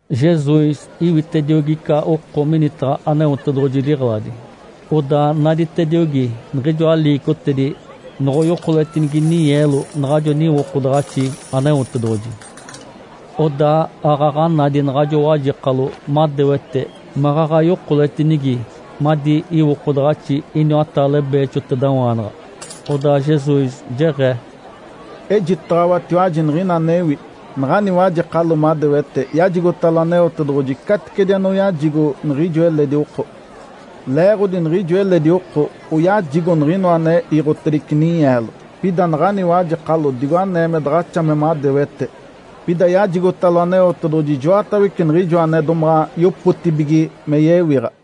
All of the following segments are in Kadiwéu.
Jesus iwitediogi ica oko minitaɡ̶a Aneotedoɡ̶oji liɡ̶eladi. Odaa naditediogi niɡ̶ijoa liicotedi noɡ̶oyokoletinigi ninyeelo naɡ̶ajo niwokodaɡ̶axi Aneotedoɡ̶oji. Odaa aaɡ̶aɡ̶a nadi naɡ̶ajo wajekalo madewete maɡ̶aɡ̶a yokoletinigi madi iwokodaɡ̶axi iniwataale beexotedawaanaɡ̶a. Odaa Jesus jeɡ̶ee, “Ejitaɡ̶awatiwaji niɡ̶ina anewi. Naɡ̶ani wajekalo madewete yajigotalo Aneotedoɡ̶oji caticedi anoyajigo niɡ̶ijo eledi oko. Leeɡ̶odi niɡ̶ijo eledi oko oyajigo niɡ̶inoa ane iiɡ̶otedice ninyeelo. Pida naɡ̶ani wajekalo digo anee me daɡ̶axa me madewete, pida yajigotalo Aneotedoɡ̶oji ijoatawece niɡ̶ijoa ane domaɡ̶a yopotibige me yewiɡ̶a.”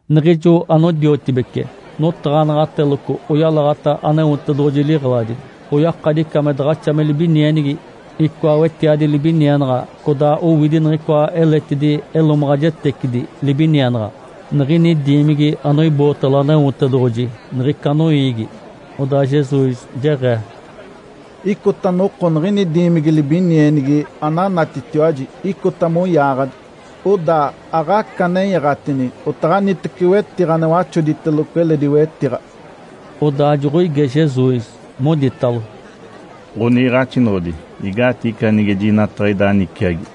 Niɡ̶ijo anodiotibece notaɡ̶anaɡ̶ateloco oyalaɡ̶ata Aneotedoɡ̶oji liɡ̶eladi, oyakadi ica me daɡ̶axa me libinienigi, icoa niwetiadi libinienaɡ̶a, codaa owidi niɡ̶icoa eletidi elomaɡ̶ajetecidi libinienaɡ̶a niɡ̶ini diimigi anoibootalo Aneotedoɡ̶oji niɡ̶ica noiigi. Odaa Jesus jeɡ̶ee, “Icota noko niɡ̶ini diimigi libinienigi ananatitiwaji icota moyaaɡ̶adi. Odaa aɡ̶aca nenyaɡ̶atini otaɡ̶anitece wetiɡ̶a ane waxoditeloco eledi wetiɡ̶a.” Odaa joɡ̶oige Jesus, moditalo, “Ǥoniiɡ̶axinoɡ̶odi, igaatigi ica nige jinataɡ̶a ida niciagi?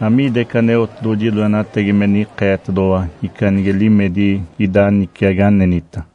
Amiida ica Aneotedoɡ̶oji loenatagi me nikeetedoɡ̶owa ica nige limedi ida niciagi anenita?”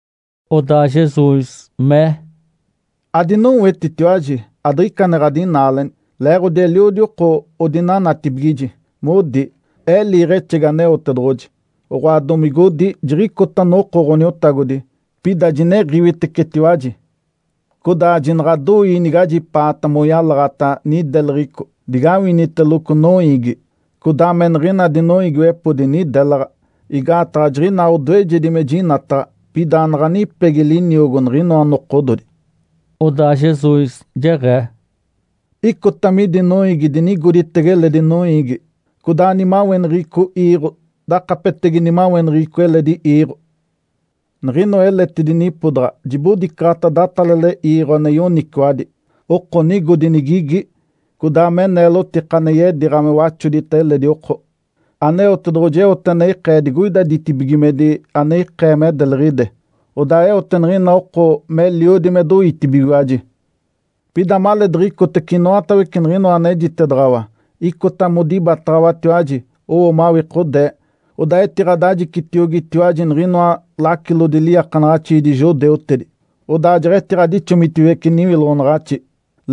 Odaa Jesus mee, “Adinowetitiwaji! Adiɡ̶ica ane ɡ̶adinaaleni, leeɡ̶odi eliodi oko odinanatibigiji, modi, ‘Ee liiɡ̶exegi Aneotedoɡ̶oji’, oɡ̶oa, domigodi, ‘Jiɡ̶icota noko Ǥoniotagodi.’ Pida jiniɡ̶iwitecetiwaji. Codaa jinaɡ̶adoii nigajipaata moyalaɡ̶ata nideleɡ̶eco digawiniteloco noiigi, codaa me niɡ̶ina dinoiigiwepodi nidelaɡ̶a. Igaataɡ̶a jiɡ̶inaa odoejedi me jinataɡ̶a, pida anaɡ̶a nipegi liniogo niɡ̶inoa nokododi.” Odaa Jesus jeɡ̶ee, “Icota midi noiigi dinigoditege eledi noiigi, codaa nimaweneɡ̶eco iiɡ̶o dakapetege nimaweneɡ̶eco eledi iiɡ̶o. Niɡ̶inoa eletidi nipodaɡ̶a jibodicaɡ̶ata datalale iiɡ̶o ane yoniciwadi, oko nigodi nigigi, codaa me neelotika ane yediiɡ̶a me waxodita eledi oko. Aneotedoɡ̶oji eote ane ikee digoida ditibigimedi ane ikee me deliɡ̶ide, odaa eote niɡ̶ina oko meliodi me doitibigiwaji. Pida maleedaɡ̶a icotece inoatawece niɡ̶inoa anejitedaɡ̶awa, icota modibataɡ̶awatiwaji, owo mawikodee. Odaa etiɡ̶adajicitiogitiwaji niɡ̶inoa lacilodi liiakanaɡ̶axiidi judeutedi, odaa jeɡ̶etiɡ̶adixomitiwece niwiloɡ̶onaɡ̶axi.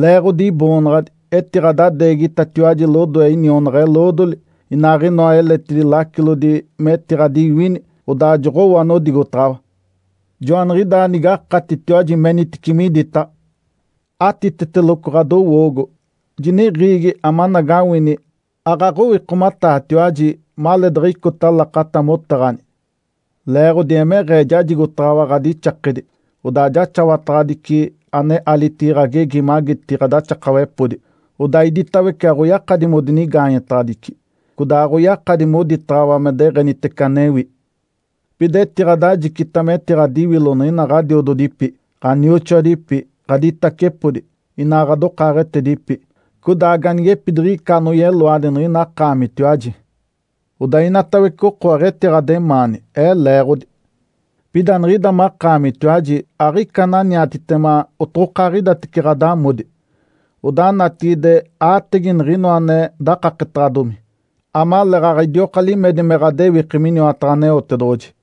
Leeɡ̶odi Iboonaɡ̶adi etiɡ̶adadeegitatiwaji lodoe inionaɡ̶a-eloodoli, inaaɡ̶inoa eletidi lacilodi metiɡ̶adiwini, odaa joɡ̶owo anodigotaɡ̶awa. Joaniɡ̶idaa nigakatitiwaji menitici miditaɡ̶a. Atiteteloco ɡ̶adowoogo, jiniɡ̶iigi amanagawini aaɡ̶aɡ̶owikomataatiwaji maleedaɡ̶a icota lakata motaɡ̶ani. Leeɡ̶odi emeɡ̶ee jajigotaɡ̶awa ɡ̶adixakedi, odaa jaxawataɡ̶adici ane alitigi ɡ̶agegi magiti ɡ̶adaxakawepodi, odaa iditawece aɡ̶oyakadi modinigaanyetaɡ̶adici, codaa aɡ̶oyakadi moditaɡ̶awa me deɡ̶enitece anewi. Pida etiɡ̶adajicita metiɡ̶adiwilo niɡ̶ina ɡ̶adiododipi, ɡ̶anioxoadipi, ɡ̶aditacepodi, inaa ɡ̶adokaaɡ̶etedipi. Codaa ganigepidiɡ̶ica anoyeloadi niɡ̶ina akaamitiwaji. Odaa inatawece oko aɡ̶etiɡ̶ademaani Ee leeɡ̶odi. Pida niɡ̶ida makaamitiwaji aɡ̶ica ananiatitema otaɡ̶aɡ̶idatece ɡ̶adamodi. Odaa natigide aatege niɡ̶inoa ane dakaketedaɡ̶adomi, amaleeɡ̶aɡ̶a idioka limedi me ɡ̶adewiki miniwataɡ̶a Aneotedoɡ̶oji.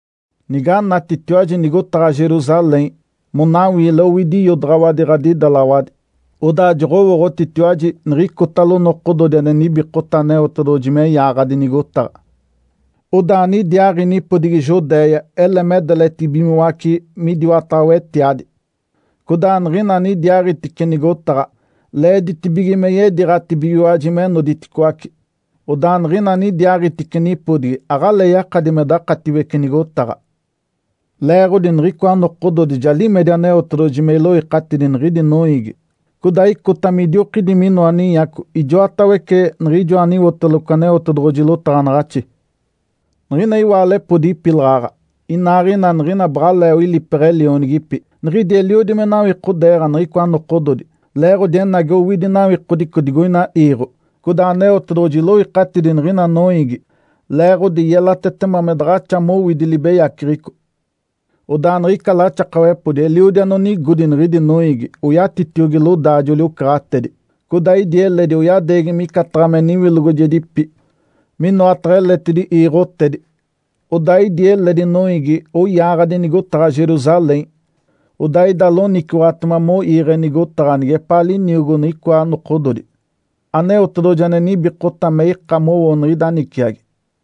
Niganatitiwaji nigotaɡ̶a Jerusalém, monawiile owidi iodaɡ̶awadi ɡ̶adidelaɡ̶awadi, odaa joɡ̶owooɡ̶otitiwaji niɡ̶icotalo nokododi ane nibikota Aneotedoɡ̶oji me yaaɡ̶adi nigotaɡ̶a. Odaa anidiaaɡ̶i nipodigi Judéia ele me deletibigimoace midiwataɡ̶a wetiadi. Codaa niɡ̶ina anidiaaɡ̶itice nigotaɡ̶a leeditibige me yediiɡ̶atibigiwaji me noditicoaci. Odaa niɡ̶ina anidiaaɡ̶itice nipodigi aɡ̶alee yakadi me dakatiwece nigotaɡ̶a. Leeɡ̶odi niɡ̶icoa nokododi ja limedi Aneotedoɡ̶oji me iloikatidi niɡ̶idi noiigi, codaa icota midiokidi minoa ninyaco ijoatawece niɡ̶ijoa aniwoteloco Aneotedoɡ̶oji lotaɡ̶anaɡ̶axi. Niɡ̶ina iwaalepodi ipilaɡ̶aɡ̶a, inaaɡ̶ina niɡ̶ina baɡ̶alee oilipeɡ̶e lionigipi, niɡ̶idi eliodi me nawikodeeɡ̶a niɡ̶icoa nokododi, leeɡ̶odi enagi owidi nawikodico digoina iiɡ̶o, codaa Aneotedoɡ̶oji iloikatidi niɡ̶ina noiigi leeɡ̶odi yelatetema me daɡ̶axa mowidi libeyaceɡ̶eco. Odaa niɡ̶ica laxakawepodi eliodi anonigodi niɡ̶idi noiigi oyatitiogi lodaajoli-ocaɡ̶atedi, codaa idi eledi oyadeegi micataɡ̶a me niwilogojegipi minoataɡ̶a eletidi iiɡ̶otedi. Odaa idi eledi noiigi oyaaɡ̶adi nigotaɡ̶a Jerusalém, odaa ida loniciwaɡ̶atema moiiɡ̶e nigotaɡ̶a nigepaa liniogo niɡ̶icoa nokododi Aneotedoɡ̶oji ane nibikota me ika mowo niɡ̶ida niciagi.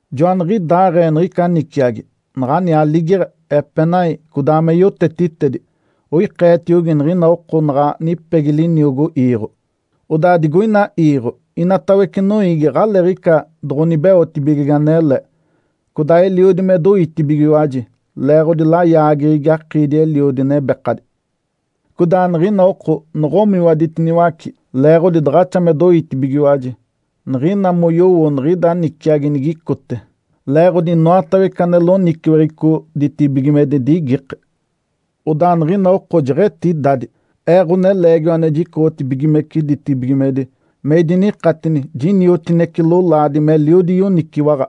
Joaniɡ̶idaaɡ̶ee niɡ̶ica niciagi, naɡ̶ani aligeɡ̶e, epenai, codaa me yotetitedi, oikeetiogi niɡ̶ina oko naɡ̶a nipegi liniogo iiɡ̶o. Odaa digoina iiɡ̶o, inatawece noiigi aɡ̶aleeɡ̶ica doɡ̶onibeotibigege anele, codaa eliodi me doitibigiwaji, leeɡ̶odi layaageɡ̶egi akiidi-eliodi, nebekadi. Codaa niɡ̶ina oko noɡ̶omiwaditiniwace leeɡ̶odi daɡ̶axa me doitibigiwaji, niɡ̶ina moyowo niɡ̶ida niciagi nigicote. Leeɡ̶odi inoatawece ane loniciweɡ̶eco ditibigimedi digikee. Odaa niɡ̶ina oko jeɡ̶etidadi, Ee, Ǥoneleegiwa ane jicoɡ̶otibigimece ditibigimedi, me idinikatini jiniotinece lolaadi, meliodi yoniciwaɡ̶a.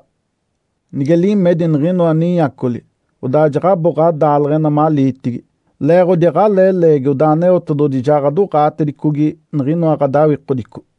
Nige limedi niɡ̶inoa ninyacoli, odaa jaɡ̶abo ɡ̶adaaleɡ̶ena maliitigi, leeɡ̶odi aɡ̶alee leegi odaa Aneotedoɡ̶oji ja ɡ̶adoɡ̶aatedicogi niɡ̶inoa ɡ̶adawikodico.”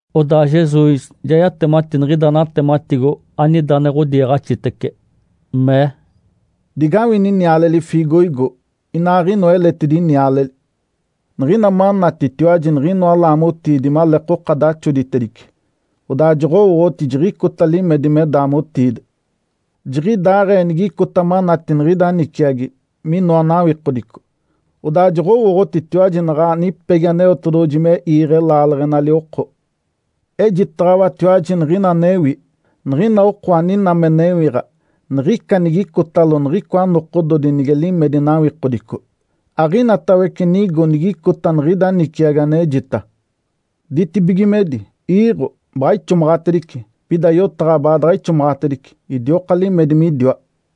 Odaa Jesus ja yatemati niɡ̶ida natematigo anida ane ɡ̶odiiɡ̶axitece, mee, “Digawini niale fiigoigo inaaɡ̶inoa eletidi nialeli. Niɡ̶ina manatitiwaji niɡ̶inoa laamotiidi maleekoka daxoditedice, odaa joɡ̶owooɡ̶oti jiɡ̶icota limedi me daamotiide. Jiɡ̶idaaɡ̶ee nigicota manati niɡ̶ida niciagi, minoa nawikodico, odaa joɡ̶owooɡ̶otitiwaji naɡ̶a nipegi Aneotedoɡ̶oji me iiɡ̶e laaleɡ̶enali oko. Ejitaɡ̶awatiwaji niɡ̶ina anewi, niɡ̶ina oko aninaa me newiɡ̶a niɡ̶ica nigicotalo niɡ̶icoa nokododi nige limedi nawikodico, aɡ̶inatawece nigo nigicota niɡ̶ida niciagi anejita. Ditibigimedi, iiɡ̶o, baɡ̶a ixomaɡ̶atedice, pida yotaɡ̶a baadaɡ̶a ixomaɡ̶atedice, idioka limedi midiwa.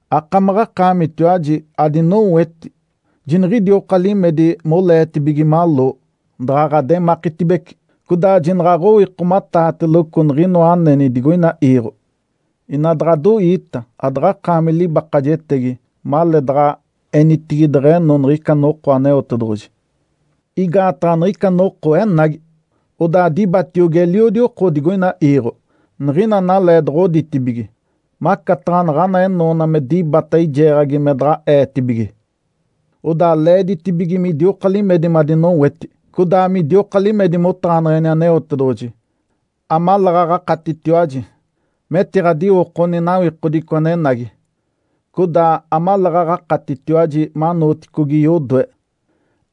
Akamaɡ̶akaamitiwaji adinoweti jiniɡ̶idioka limedi moleetibige maloo, daɡ̶a ɡ̶ademakitibece, codaa jinaɡ̶aɡ̶owikomataatelogo niɡ̶inoa aneni digoina iiɡ̶o. Ina daɡ̶adoiita adaɡ̶akaami libakajetegi maleedaɡ̶a enitigi deɡ̶eno niɡ̶ica noko Aneotedoɡ̶oji. Igaataɡ̶a niɡ̶ica noko enagi, odaa dibatiogi eliodi oko digoina iiɡ̶o, niɡ̶ina analee doɡ̶oditibige, macataɡ̶a naɡ̶ana enoona me dibata eijeeɡ̶agi me daɡ̶a eetibige. Odaa leeditibige midioka limedi madinoweti, codaa midioka limedi motaɡ̶aneɡ̶eni Aneotedoɡ̶oji, amaleeɡ̶aɡ̶a akatitiwaji metiɡ̶adiwokoni nawikodico anenagi, codaa amaleeɡ̶aɡ̶a akatitiwaji manooticogi yodoe,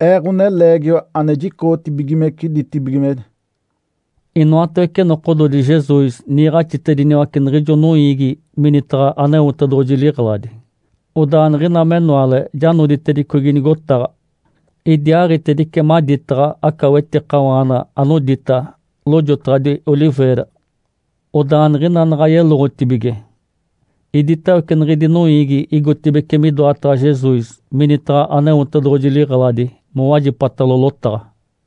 Ee, Ǥoneleegiwa ane jicoɡ̶otibigimece ditibigimedi.” Inoatawece nokododi Jesus niiɡ̶axitediniwace niɡ̶ijo noiigi minitaɡ̶a Aneotedoɡ̶oji liɡ̶eladi. Odaa niɡ̶ina menoale ja noditedicogi nigotaɡ̶a, idiaaɡ̶itedice maditaɡ̶a aca wetikawaana anodita, “Lojotaɡ̶adi Oliveira”. Odaa niɡ̶ina naɡ̶a yeloɡ̶otibige, iditawece niɡ̶idi noiigi igotibeci midoataɡ̶a Jesus minitaɡ̶a Aneotedoɡ̶oji liɡ̶eladi mowajipatalo lotaɡ̶a.